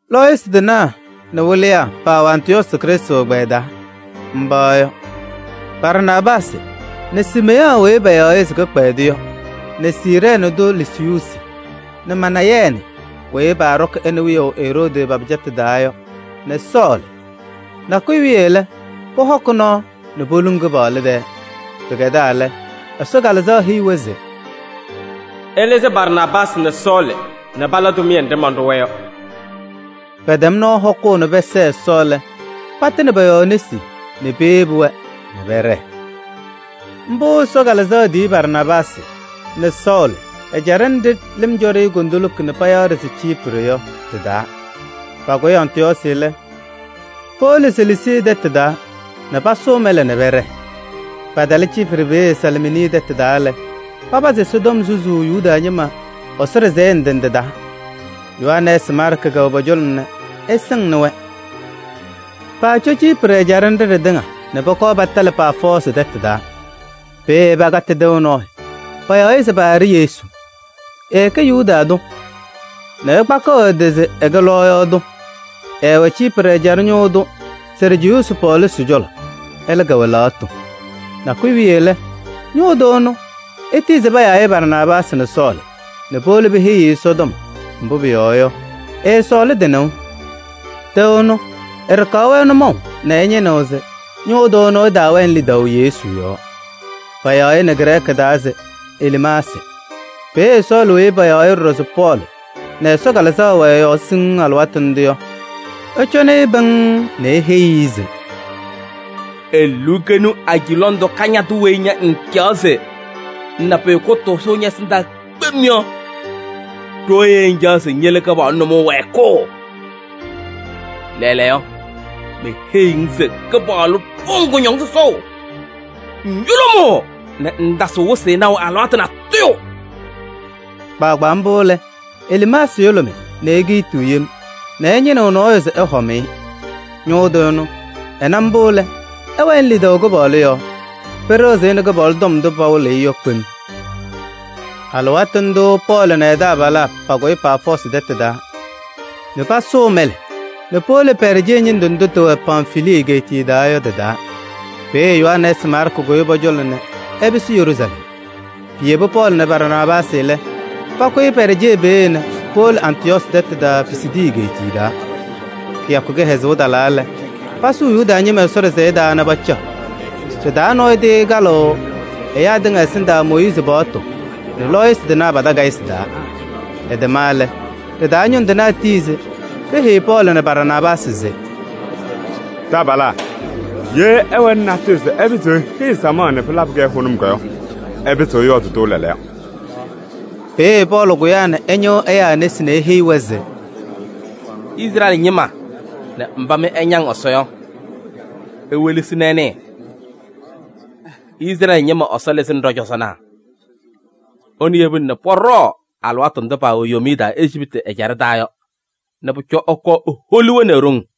Lɔɔyɩsɩ tɩnaa nɛ wɩlɩyaa paawɛ Antɩyɔɔsɩ Krɩstʋ ɛgbɛyɛ taa. Mba yɔ: Barnaabaasɩ nɛ Siimeyɔɔ weyi payaɣ se Kɩkpɛdʋ yɔ nɛ Siirɛɛnɩ tʋ Lusiyuusi nɛ Manayɛɛnɩ weyi paaɖɔkɩ ɛ nɛ wiyaʋ Eroodi pa-pɩcatʋ taa yɔ nɛ Sɔɔlɩ. Nakʋyʋ wiye lɛ, pɔhɔkɩ nɔɔ nɛ poluŋuu Kɩpaɣlʋ tɛɛ. Pɩkɛdaa lɛ, Ɛsɔ Kalɩzaɣ heyi-wɛ se: “Ɩlɩzɩ Barnaabaasɩ nɛ Sɔɔlɩ nɛ pala tʋmɩyɛ nɖɩ manɖʋ-wɛ yɔ.” Pɛtɛm nɔɔ hɔkʋʋ nɛ pɛsɛɛ Ɛsɔ lɛ, patɩnɩ pɔ-yɔɔ nesi nɛ peyebi-wɛ nɛ pɛɖɛɛ. Mbʋ Ɛsɔ Kalɩzaɣ tiyi Barnaabaasɩ nɛ Sɔɔlɩ ɛjaɖɛ nɖɩ lɩm cɔ-ɖɩ kondiko nɛ payaɣ-ɖɩ se Ciiprɩ yɔ ɖɩ-taa. Pakʋyɩ Antɩyɔɔsɩ lɛ, powolo Selesii tɛtʋ taa nɛ pasʋʋ mɛlɛ nɛ pɛɖɛɛ. Patalɩ Ciiprɩ peeye Salaamiini tɛtʋ taa lɛ, papazɩ Ɛsɔtɔm susuu Yuda ñɩma Ɛsɔ ɖɩsɛyɛ ndɩ ndɩ taa. Yohanɛɛsɩ Maarkɩ kɛwɛ pɔ-cɔlɔ nɛ ɛsɩŋnɩ-wɛ. Paacɔ Ciiprɩ ɛjaɖɛ nɖɩ ɖɩtɩŋa nɛ pɔkɔɔ patalɩ Paafɔɔsɩ tɛtʋ taa. Peeye pakatɩ tɩʋ nɔɔyʋ, payaɣ-ɩ se Baarɩ-Yesu. Ɛɛkɛ Yuda tʋ nɛ ɛkpakɩɣ ɛ-tɩ se ɛkɛ lɔɔyaɣ tʋ. Ɛɛwɛ Ciiprɩ ɛjaɖɛ ñʋʋ tʋ Sɛrjiyuusi Pɔɔlusi cɔlɔ, ɛlɛ kɛwɛ lɛɣtʋ. Nakʋyʋ wiye lɛ, ñʋʋ tʋ ɛnʋ, etiyi se payaa-ɩ Barnaabaasɩ nɛ Sɔɔlɩ nɛ powolo peheyi-i Ɛsɔtɔm, mbʋ pʋyɔɔ yɔ, ɛsɔɔlɩ tɩ-nɩʋ. Tɩʋ ɛnʋ, ɛɖɩkaɣ-wɛ nʋmɔʋ nɛ ɛñɩnɩɣ se ñʋʋ tʋ ɛnʋ ɛtaawɛnɩ lidaʋ Yesu yɔɔ. Payaɣ-ɩ nɛ Grɛɛkɩ taa se: Eliimaasɩ. Peeye Sɔɔlɩ weyi payaɣ ɖɔɖɔ se Pɔɔlɩ nɛ Ɛsɔ Kalɩzaɣ wɛ ɛ-yɔɔ siŋŋ alɩwaatʋ ndʋ yɔ, ɛcɔnɩ-ɩ pɩŋŋ nɛ eheyi-i se: “Eluukenu aji lɔŋ tʋ kañadʋ weyi ña ŋŋcaɣ se ŋna pʋyʋ kʋtʋʋzʋ ñɛ-ɛsɩndaa kpem yɔ! Ɖooye ŋcaɣ se ŋyele Kɩpaɣlʋ nʋmɔŋ wɛɛkʋʋ? Lɛɛlɛɛyɔ, meheyiɣ-ŋ se Kɩpaɣlʋ ɖʋʋ-ŋ kʋñɔŋ sɔsɔʋ: ŋyʋlʋmʋʋ nɛ ŋŋtasɩɣ wɩsɩ naʋ alɩwaatʋ natʋyʋ.” Kpaagbaa mbʋ lɛ, Eliimaasɩ yʋlʋmɩ nɛ ekiitiɣ yem nɛ ɛñɩnɩɣ nɔɔyʋ se ɛhɔm-ɩ. Ñʋʋ tʋ ɛnʋ, ɛna mbʋ lɛ, ɛwɛnɩ lidaʋ Kɩpaɣlʋ yɔɔ. Pɩɩɖɩɣzɩ-ɩ nɛ Kɩpaɣlʋ tɔm ndʋ pawɩlɩ-ɩ yɔ kpem. Alɩwaatʋ ndʋʋ Pɔɔlɩ nɛ ɛ-taabalaa pakʋyɩ Paafɔɔsɩ tɛtʋ taa nɛ pasʋʋ mɛlɛ nɛ powolo Pɛɛrjee ñɩndʋ ndʋ tɩwɛ Pamfilii egeetiye taa yɔ tɩ-taa. Peeye Yohanɛɛsɩ Maarkɩ kʋyɩ pɔ-cɔlɔ nɛ ɛpɩsɩ Yeruusalɛm. Piyebi Pɔɔlɩ nɛ Barnaabaasɩ lɛ, pakʋyɩ Pɛɛrjee peeye nɛ powolo Antɩyɔɔsɩ tɛtʋ taa Pisidii egeetiye taa. Kɩyakʋ kɩhɛzʋʋ talaa lɛ, pasʋʋ Yuda ñɩma Ɛsɔ ɖɩsɛyɛ taa nɛ pacaɣ. Ɖɩ-taa nɔɔyʋ tɩɩkalɩɣ ɛyaa tɩŋa ɛsɩndaa Mooyiizi paɣtʋ nɛ lɔɔyɩsɩ tɩnaa pa-takayɩsɩ taa. Ɛtɛma lɛ, ɖɩ-taa ñʋŋ tɩnaa tiyi se peheyi Pɔɔlɩ nɛ Barnaabaasɩ se: “Taabalaa! Ye ɩwɛnɩ natʋyʋ se iheyiɣ samaɣ nɛ pɩlabɩ-kɛ hʋnʋm yɔ, ɩpɩzɩɣ ɩyɔɔdɩ-tʋ lɛɛlɛɛyɔ.” Peeye Pɔɔlɩ kʋyaa nɛ ɛñɩɣ ɛyaa nesi nɛ eheyi-wɛ se: “Izrɛɛlɩ ñɩma nɛ mba mɩ ɩñaŋ Ɛsɔ yɔ! Iwelesi nɛ ɩnɩɩ: Izrɛɛlɩ ñɩma Ɛsɔ lɩzɩnɩ ɖɔ-cɔzɔnaa. Ɛnʋ yebina nɛ pɔɖɔɔ alɩwaatʋ ndʋ paawɛ yomiye taa Ejiptɩ ɛjaɖɛ taa yɔ nɛ pʋcɔ ɛkɔɔ eholi-wɛ nɛ e-ɖoŋ.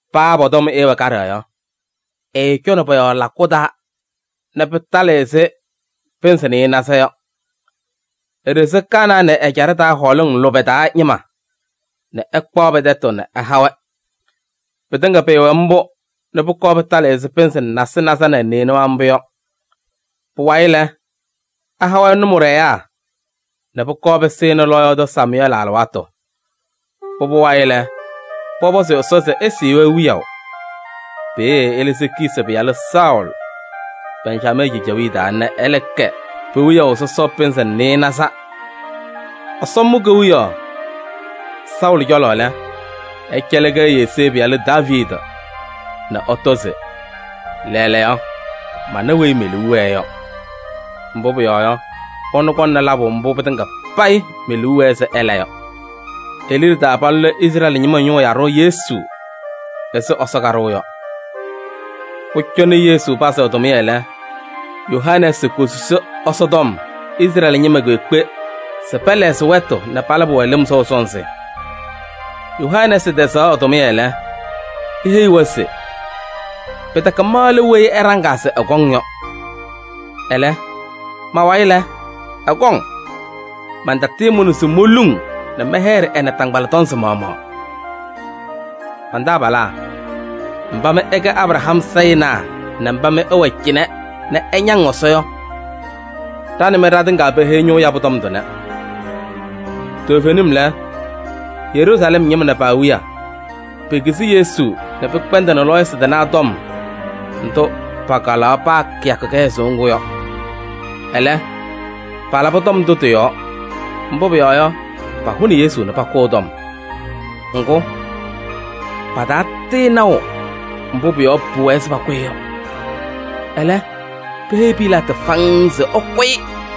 Paa pɔ-tɔm ɛɛwɛ kaɖɛ yɔ, ɛɛcɔnɩ pɔ-yɔɔ lakʋ taa nɛ pɩtalɩ ɛzɩ pɩnzɩ nɩɩnaza yɔ. Eɖezi Kanaanɩ ɛjaɖɛ taa hɔɔlɩŋ lʋbɛ taa ñɩma nɛ ɛkpaɣ pɛ-tɛtʋ ɛha-wɛ. Pɩtɩŋa pɩɩwɛ mbʋ nɛ pʋkɔɔ pɩtalɩ ɛzɩ pɩnzɩ nasɩnaza nɛ nɩɩnʋwa mbʋ yɔ. Pʋwayɩ lɛ, ɛha-wɛ nʋmɔɖɛyaa nɛ pʋkɔɔ pɩsɩnɩ lɔɔyaɣ tʋ Samʋyɛɛlɩ alɩwaatʋ. Pʋbʋ wayɩ lɛ, pɔpɔzɩ Ɛsɔ se ɛsɩɩ-wɛ wiyaʋ. Peeye ɛlɩzɩ Kiisi pɩyalʋ Saʋlɩ, Bɛnjamɛɛ cejewiye taa nɛ ɛlɛ kɛ pe-wiyaʋ sɔsɔ pɩnzɩ nɩɩnaza. Ɛsɔ mʋ kewiyaɣ Saʋlɩ cɔlɔ lɛ, ɛcɛlɩ-kɛ Yesee pɩyalʋ Daaviidi nɛ ɛtɔ se: ‘Lɛɛlɛɛyɔ, mana weyi me-liu wɛɛ yɔ, mbʋ pʋyɔɔ yɔ, ɛnʋ kɔŋnɩ labʋ mbʋ pɩtɩŋa payɩ me-liu wɛɛ se ɛla yɔ.’ E-liɖe taa palʋlɩ Izrɛɛlɩ ñɩma ñʋʋ yaɖʋ Yesu ɛzɩ Ɛsɔ kaɖʋʋ yɔ. Pʋcɔ nɛ Yesu pazɩ ɛ-tʋmɩyɛ lɛ, Yohanɛɛsɩ kosusi Ɛsɔtɔm Izrɛɛlɩ ñɩma kpeekpe se pɛlɛɣzɩ wɛtʋ nɛ palabɩ-wɛ lɩm sɔʋ sɔnzɩ. Yohanɛɛsɩ tɛzaɣ ɛ-tʋmɩyɛ lɛ, eheyi-wɛ se: ‘Pɩtɛkɛ ma lɛ weyi ɩɖaŋaa se ɛkɔŋ yɔ. Ɛlɛ, ma-wayɩ lɛ, ɛkɔŋ. Mantatɩɩmʋnɩ se moluŋ nɛ mɛyɛɖɩ ɛ-naataŋgbala tɔnzɩ maɣmaɣ.’ Man-taabalaa, mba mɩ ɩkɛ Abraham sayɩnaa nɛ mba mɩ ɩwɛ cɩnɛ nɛ ɩñaŋ Ɛsɔ yɔ! Ɖa nɛ mɩ ɖatɩŋa peheyi ñʋʋ yabʋ tɔm tʋnɛ. Toovenim lɛ, Yeruusalɛm ñɩma nɛ pa-awiya, pekizi Yesu nɛ pɩkpɛndɩnɩ lɔɔyɩsɩ tɩnaa tɔm ndʋ pakalaɣ paa kɩyakʋ kɩhɛzʋʋ ŋgʋ yɔ. Ɛlɛ, palabɩ tɔm ndʋ tɩ-yɔɔ, mbʋ pʋyɔɔ yɔ, pahʋnɩ Yesu nɛ pakʋ ɛ-tɔm. Ŋgʋ, patatɩɩnaʋ mbʋ pʋ-yɔɔ pʋwɛɛ se pakʋ-ɩ yɔ. Ɛlɛ, peheyi Pilaatɩ faŋŋ se ɛkʋ-ɩ.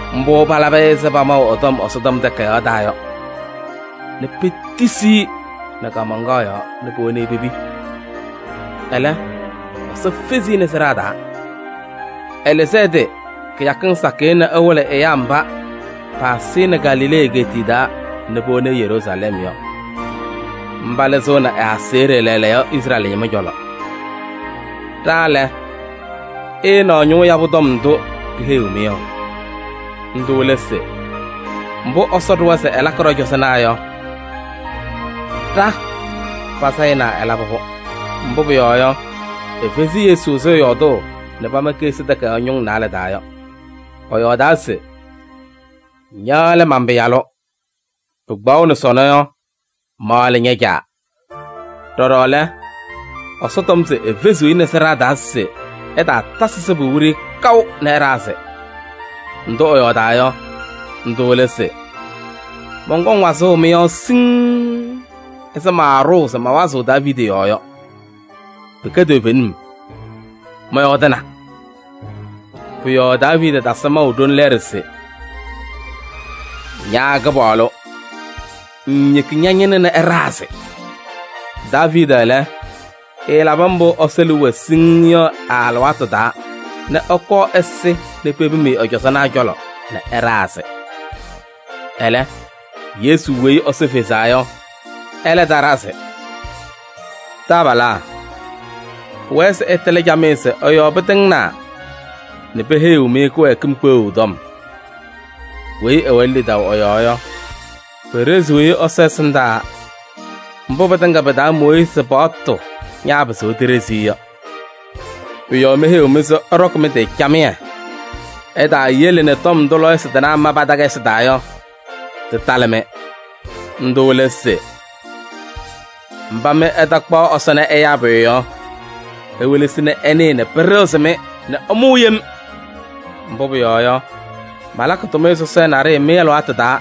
Mbʋ palabɩ-ɩ ɛzɩ pamaʋ ɛ-tɔm Ɛsɔtɔm Takayaɣ taa yɔ nɛ petisi-i nɛ kaamaŋkaɣ yɔɔ nɛ powoni pepi. Ɛlɛ, Ɛsɔ fezi-i nɛ sɩɖaa taa. Ɛlɩzɩ ɛ-tɩ kɩyakɩŋ sakɩyɛ nɛ ɛwɩlɩ ɛyaa mba paasɩ-ɩ nɛ Galilee egeetiye taa nɛ powoni-i Yeruusalɛm yɔ. Mba lɩzɩɣnɩ ɛ-aseɣɖe lɛɛlɛɛyɔ Izrɛɛlɩ ñɩma cɔlɔ. Ɖa lɛ, ɩɩnaɣ ñʋʋ yabʋ tɔm ndʋ ɖiheyiɣ-mɩ yɔ. Ndʋ lɛ se: mbʋ Ɛsɔ ɖʋwa se ɛlakɩ ɖɔ-cɔzɔnaa yɔ, ɖa pa-sayɩnaa ɛlabɩ-pʋ. Mbʋ pʋyɔɔ yɔ, efezi Yesu ɛzɩ ɛyɔɔdʋʋ nɛ pama Keɣsi Takayaɣ ñʋŋ naalɛ taa yɔ. Ɛyɔɔdaa se: ‘Ña lɛ man-Pɩyalʋ. Pɩkpaɣʋnɩ sɔnɔ yɔ, ma lɛ ña-Caa.’ Ɖɔɖɔ lɛ, Ɛsɔ tɔm se efeziɣ-i nɛ sɩɖaa taa se ɛtaatasɩ sɩbʋ wiɖiyi kaʋ nɛ ɛɖazɩ. Ndʋ ɛyɔɔdaa yɔ, ndʋ lɛ se: ‘Mɔnkɔŋ wazʋʋ mɩ-yɔɔ siŋŋ ɛzɩ maaɖʋʋ se mawazɩɣ Daaviidi yɔɔ yɔ. Pɩkɛ toovenim, mɔyɔɔdɩna.’ Pʋ-yɔɔ Daaviidi tasɩ maʋ ɖoli lɛɛɖɛ se: ‘Ña Kɩpaɣlʋ, ŋŋyeki ña-ñɩnʋ nɛ ɛɖazɩ.’ Daaviidi lɛ, ɛɛlabɩ mbʋ Ɛsɔ liu wɛɛ siŋŋ yɔ ɛ-alɩwaatʋ taa nɛ ɛkɔɔ ɛsɩ nɛ pepim-i ɛ-cɔzɔnaa cɔlɔ nɛ ɛɖazɩ. Ɛlɛ, Yesu weyi Ɛsɔ fezaa yɔ, ɛlɛ taɖazɩ. Taabalaa! Pʋwɛɛ se ɩtɩlɩ camɩyɛ se ɛ-yɔɔ pɩtɩŋnaa nɛ peheyiɣ-mɩ kɩwɛɛkɩm kpeɣu tɔm. Weyi ɛwɛnɩ lidaʋ ɛ-yɔɔ yɔ, peɖeziɣ-i Ɛsɔ ɛsɩndaa mbʋ pɩtɩŋa pɩ-taa Mooyiizi paɣtʋ ñaapɩzɩɣ tiɖezi-i yɔ. Pʋ-yɔɔ meheyiɣ-mɩ se ɩɖɔkɩ mɩ-tɩ camɩyɛ, ɩtaayele nɛ tɔm ndʋ lɔɔyɩsɩ tɩnaa ma pa-takayɩsɩ taa yɔ, tɩtalɩ-mɩ. Ndʋ lɛ se: ‘Mba mɩ ɩtakpaɣ Ɛsɔ nɛ ɛyaa pʋyʋ yɔ, iwelesi nɛ ɩnɩɩ nɛ pɩɖɩɣzɩ-mɩ nɛ ɩmʋʋ yem! Mbʋ pʋyɔɔ yɔ, malakɩ tʋmɩyɛ sɔsɔɖɛ naɖɩyɛ mɩ-alɩwaatʋ taa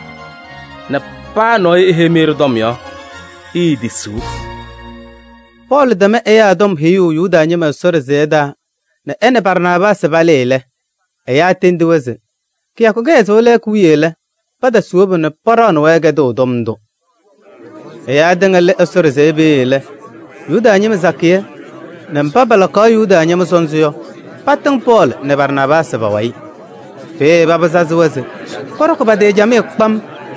nɛ paa nɔɔyʋ eheyi-mɩ ɖɩ-tɔm yɔ, iitisiɣ.’” Pɔɔlɩ tɛm ɛyaa tɔm heyuu Yuda ñɩma Ɛsɔ ɖɩsɛyɛ taa nɛ ɛ nɛ Barnaabaasɩ palɩɩ lɛ, ɛyaa tendi-wɛ se: kɩyakʋ kɩhɛzʋʋ lɛɛkʋ wiye lɛ, paatasɩ wobu nɛ paɖaɣnɩ-wɛ kɛdʋʋ tɔm ndʋ. Ɛyaa tɩŋa lɩ Ɛsɔ ɖɩsɛyɛ peeye lɛ, Yuda ñɩma sakɩyɛ nɛ mba palakaɣ Yuda ñɩma sɔnzɩ yɔ, patɩŋ Pɔɔlɩ nɛ Barnaabaasɩ pa-wayɩ. Peeye paba sazɩ-wɛ se pɔɖɔkɩ pa-tɩ camɩyɛ kpam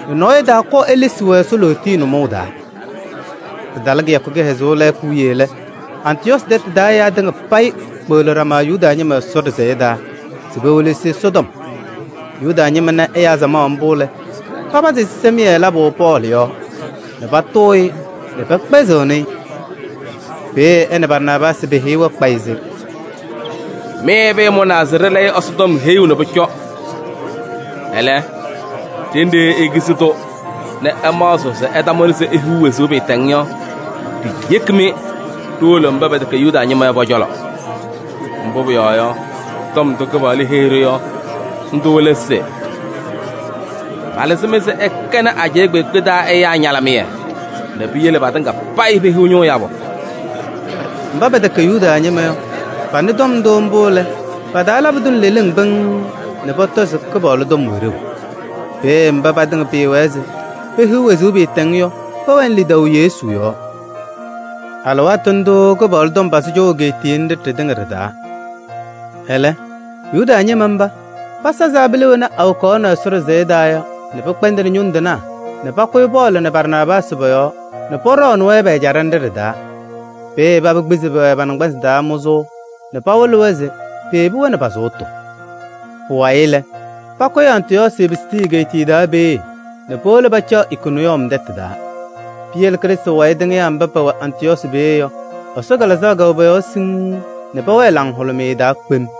nɛ nɔɔyʋ ɛtaakɔɔ elesi-wɛ Ɛsɔ lootiye nʋmɔʋ taa. Pɩtalɩ kɩyakʋ kɩhɛzʋʋ lɛɛkʋ wiye lɛ, Antɩyɔɔsɩ tɛtʋ taa ɛyaa tɩŋa payɩ kpeɣli ɖama Yuda ñɩma Ɛsɔ ɖɩsɛyɛ taa se pewelesi Ɛsɔtɔm. Yuda ñɩma na ɛyaa samaɣ mbʋ lɛ, papazɩ ɛzɩsɛmɩyɛ labʋ Pɔɔlɩ yɔɔ nɛ patʋʋ-ɩ nɛ pɛkpɛzɩɣnɩ-ɩ. Peeye ɛ nɛ Barnaabaasɩ peheyi-wɛ kpayɩ se: “Mɩ pɩɩmʋnaa se ɖɩlɛyɩnɩ Ɛsɔtɔm heyuu nɛ pʋcɔ. Ɛlɛ, ɖenɖe ikizi-tʋ nɛ ɩmaɣzɩɣ se ɩtamʋnɩ se ihiɣ wezuu pɩɩtɛŋ yɔ, ɖiyeki-mɩ ɖiwolo mba pɛtɛkɛ Yuda ñɩma yɔ pɔ-cɔlɔ. Mbʋ pʋyɔɔ yɔ, tɔm ndʋ Kɩpaɣlʋ heyi-ɖʋ yɔ, ndʋ lɛ se: ‘Malɩzɩ-mɩ se ɩkɛnɩ ajɛɛ kpeekpe taa ɛyaa ñalɩmɩyɛ nɛ piyele patɩŋa payɩ pehiɣ ñʋʋ yabʋ.’” Mba pɛtɛkɛ Yuda ñɩma yɔ, panɩ-tʋ mbʋ lɛ, pa-taa labɩ-tʋ nɛ leleŋ pɩŋŋ nɛ pɔtɔ se Kɩpaɣlʋ tɔm wɛ ɖeu. Peeye mba patɩŋa pɩɩwɛɛ se pehiɣ wezuu pɩɩtɛŋ yɔ, pɛwɛnɩ lidaʋ Yesu yɔɔ. Alɩwaatʋ ndʋʋ Kɩpaɣlʋ tɔm pazɩ cɔʋ egeetiye nɖɩ ɖɩtɩŋa ɖɩ-taa. Ɛlɛ, Yuda ñɩma mba, pasazɩ abila wena awokaɣ Ɛsɔ ɖɩsɛyɛ taa yɔ nɛ pɩkpɛndɩnɩ tɛtʋ ñʋŋ tɩnaa nɛ pakʋyɩ Pɔɔlɩ nɛ Barnaabaasɩ pɔ-yɔɔ nɛ pɔɖɔɔnɩ-wɛ pɛ-ɛjaɖɛ nɖɩ ɖɩ-taa. Peeye paba kpizi-wɛ pa-naŋgbanzɩ taa mʋzʋʋ nɛ pɩwɩlɩ se peyebi-wɛ nɛ pa-sʋʋtʋ. Pʋwayɩ lɛ, pakʋyɩ Antɩyɔɔsɩ Pisidii egeetiye taa peeye nɛ powolo pacaɣ Ikoniyɔm tɛtʋ taa. Piyele Krɩstʋ wayɩ tɩŋɩyaa mba pɛwɛ Antɩyɔɔsɩ peeye yɔ, Ɛsɔ Kalɩzaɣ kɛwɛ pɔ-yɔɔ siŋŋ nɛ pɛwɛɛ laŋhʋlʋmɩyɛ taa kpem.